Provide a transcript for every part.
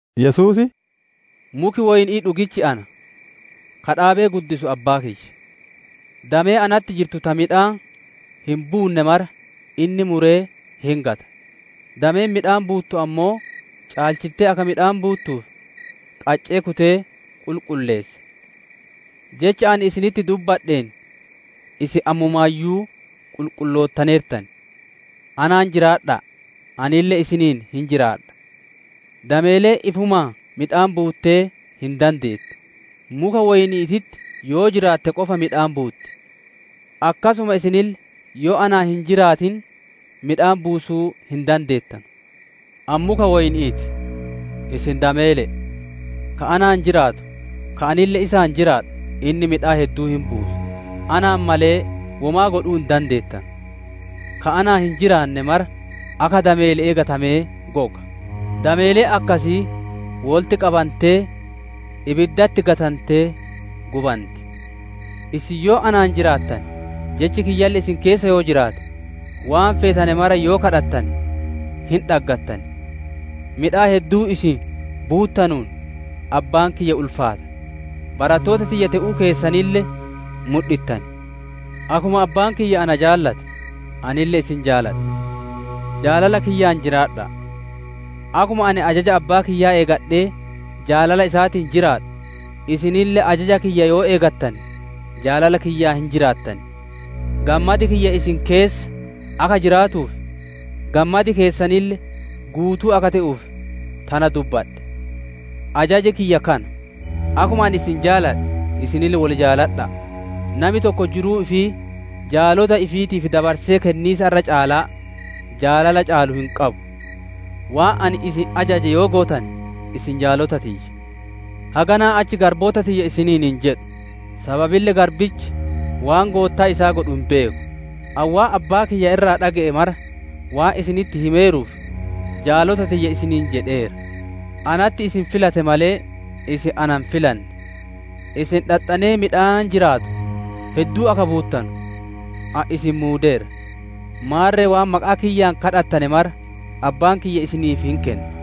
Yesuus, «Muki woyni'ii dhugichi Ana; ka dhaabee guddisu Abbaa kiyya. Damee natti jirtu ta midhaan hin buunne mara inni muree hin gata; dameen midhaan buuttu ammoo caalchitte akka midhaan buuttuuf, qaccee kutee qulqulleessa. Jecha ani isinitti dubbadheen isin ammumaayyuu qulqulloontaneertan. Anaan jiraadha'a, anille isiniin hin jiraadha. Dameeleen ifumaan midhaan buuttee hin dandeettu; muka woyni'iititti yoo jiraatte qofa midhaan buutti. Akkasuma isinille yoo anaan hin jiraatin midhaan buusuu hin dandeettanu. «Ani muka woyni'ii ti, isin dameele'e. Ka anaan jiraatu, ka anille isaan jiraadhu, inni midhaan hedduu hin buusa; anaan malee womaa godhuu hin dandeettanu. Ka anaan hin jiraanne mara akka dameele'ee gatamee goga; dameeleen akkasii wolitti qabantee ibiddatti gatantee gubanti. Isin yoo anaan jiraattane, jechi kiyyalle isin keessa yoo jiraate, waan feetane mara yoo gaafattane hin dhaggattan. Midhaan hedduu isin buuttanuun Abbaan kiyya ulfaata; barattoota tiyya te'uu keessanille mudhittan. Akkuma Abbaan kiyya na jaalate anille isin jaaladhe; jaalala kiyyaan jiraadha'a. Akkuma ani ajaja Abbaa kiyyaa eegadhe jaalala isaatiin jiraadhu, isinille ajaja kiyya yoo eegattane, jaalala kiyyaan hin jiraattan. «Gammadi kiyya isin keessa akka jiraatuuf, gammadi keessanille guutuu akka te'uuf tana dubbadhe. Ajaji kiyya kana: akkuma ani isin jaaladhe, isinille wol jaaladha'a. Nami tokko jiruu ifii jaalota ifiitiif dabarsee kenniisa irra caalaa, jaalala caalu hin qabu. Waan ani isin ajaje yoo gootane isin jaalota tiyya. Haganaa achi garboota tiyya isiniin hin jedhu, sababille garbichi waan goottaan isaa godhu hin beeku. Ani waan Abbaa kiyya irraa dhage'e mara waan isinitti himeeruuf, jaalota tiyya isiniin jedheera. Anatti isin filate malee, isin na hin filanne. Isin dhaxxanee midhaan jiraatu hedduu akka buuttanu, ani isin muudeera. Maarre waan maqaa kiyyaan gaafattane mara Abbaan kiyya isiniif hin kenna.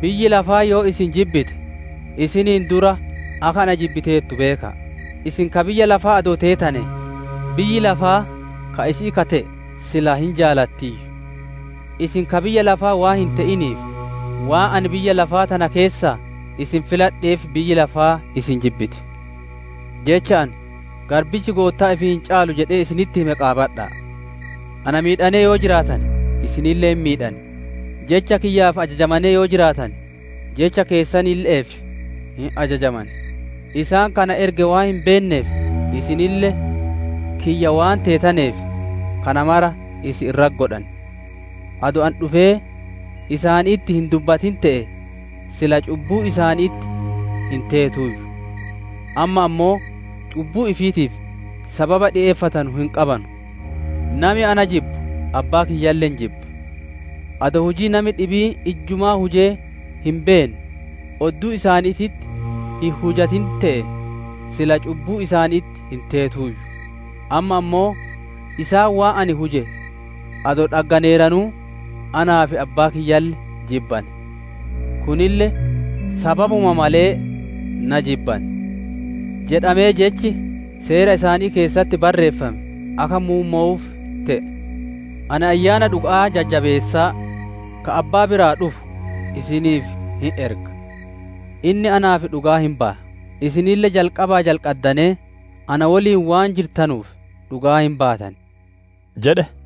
«Biyyi lafaa yoo isin jibbite, isiniin duraa akka na jibbiteertu beeka'a. Isin ka biyya lafaa adoo teetanee, biyyi lafaa ka isi'ii ka te'e silaa hin jaalattiiyyu. Isin ka biyya lafaa waan hin te'inii fi waan ani biyya lafaa tana keessaa isin filadheef biyyi lafaa isin jibbiti. Jecha ani, ‹Garbichi goottaa ifii hin caalu› jedhee isinitti hime qaabadha'a. Na miidhanee yoo jiraatane, isinille hin miidhan; Jecha kiyyaaf ajajamanee yoo jiraatane, jecha keessanille'eef hin ajajaman. Isaan ka na erge waan hin beenneef, isinille kiyya waan teetaneef, kana mara isin irratti godhan. Adoo ani dhufee isaanitti hin dubbatin te'ee, silaa cubbuu isaanitti hin teetuuyyu. Amma ammoo cubbuu ifiitiif sababa dhikeeffatanu hin qabanu. Nami na jibbu Abbaa kiyyalle hin jibba. Adoo hujii nami dhibiin ijjumaa hujee hin beenne odduu isaaniititti hin hujatin te'ee, silaa cubbuu isaanitti hin teetuuyyu; amma ammoo isaan waan ani huje adoo dhagganeeranuu, anaa fi Abbaa kiyyalle jibbane. Kunille, ‹Sababuma malee na jibbane› jedhamee jechi Seera isaanii keessatti barreeffame akka muummowuuf te'e. «Ani Ayyaana dhuga'aa Jajjabeessaa, ka Abbaa biraa dhufu, isiniif hin erga. Inni naaf dhugaa hin baya. Isinille jalqabaa jalqaddanee na woliin waan jirtanuuf, dhugaa hin baatan» jedhe.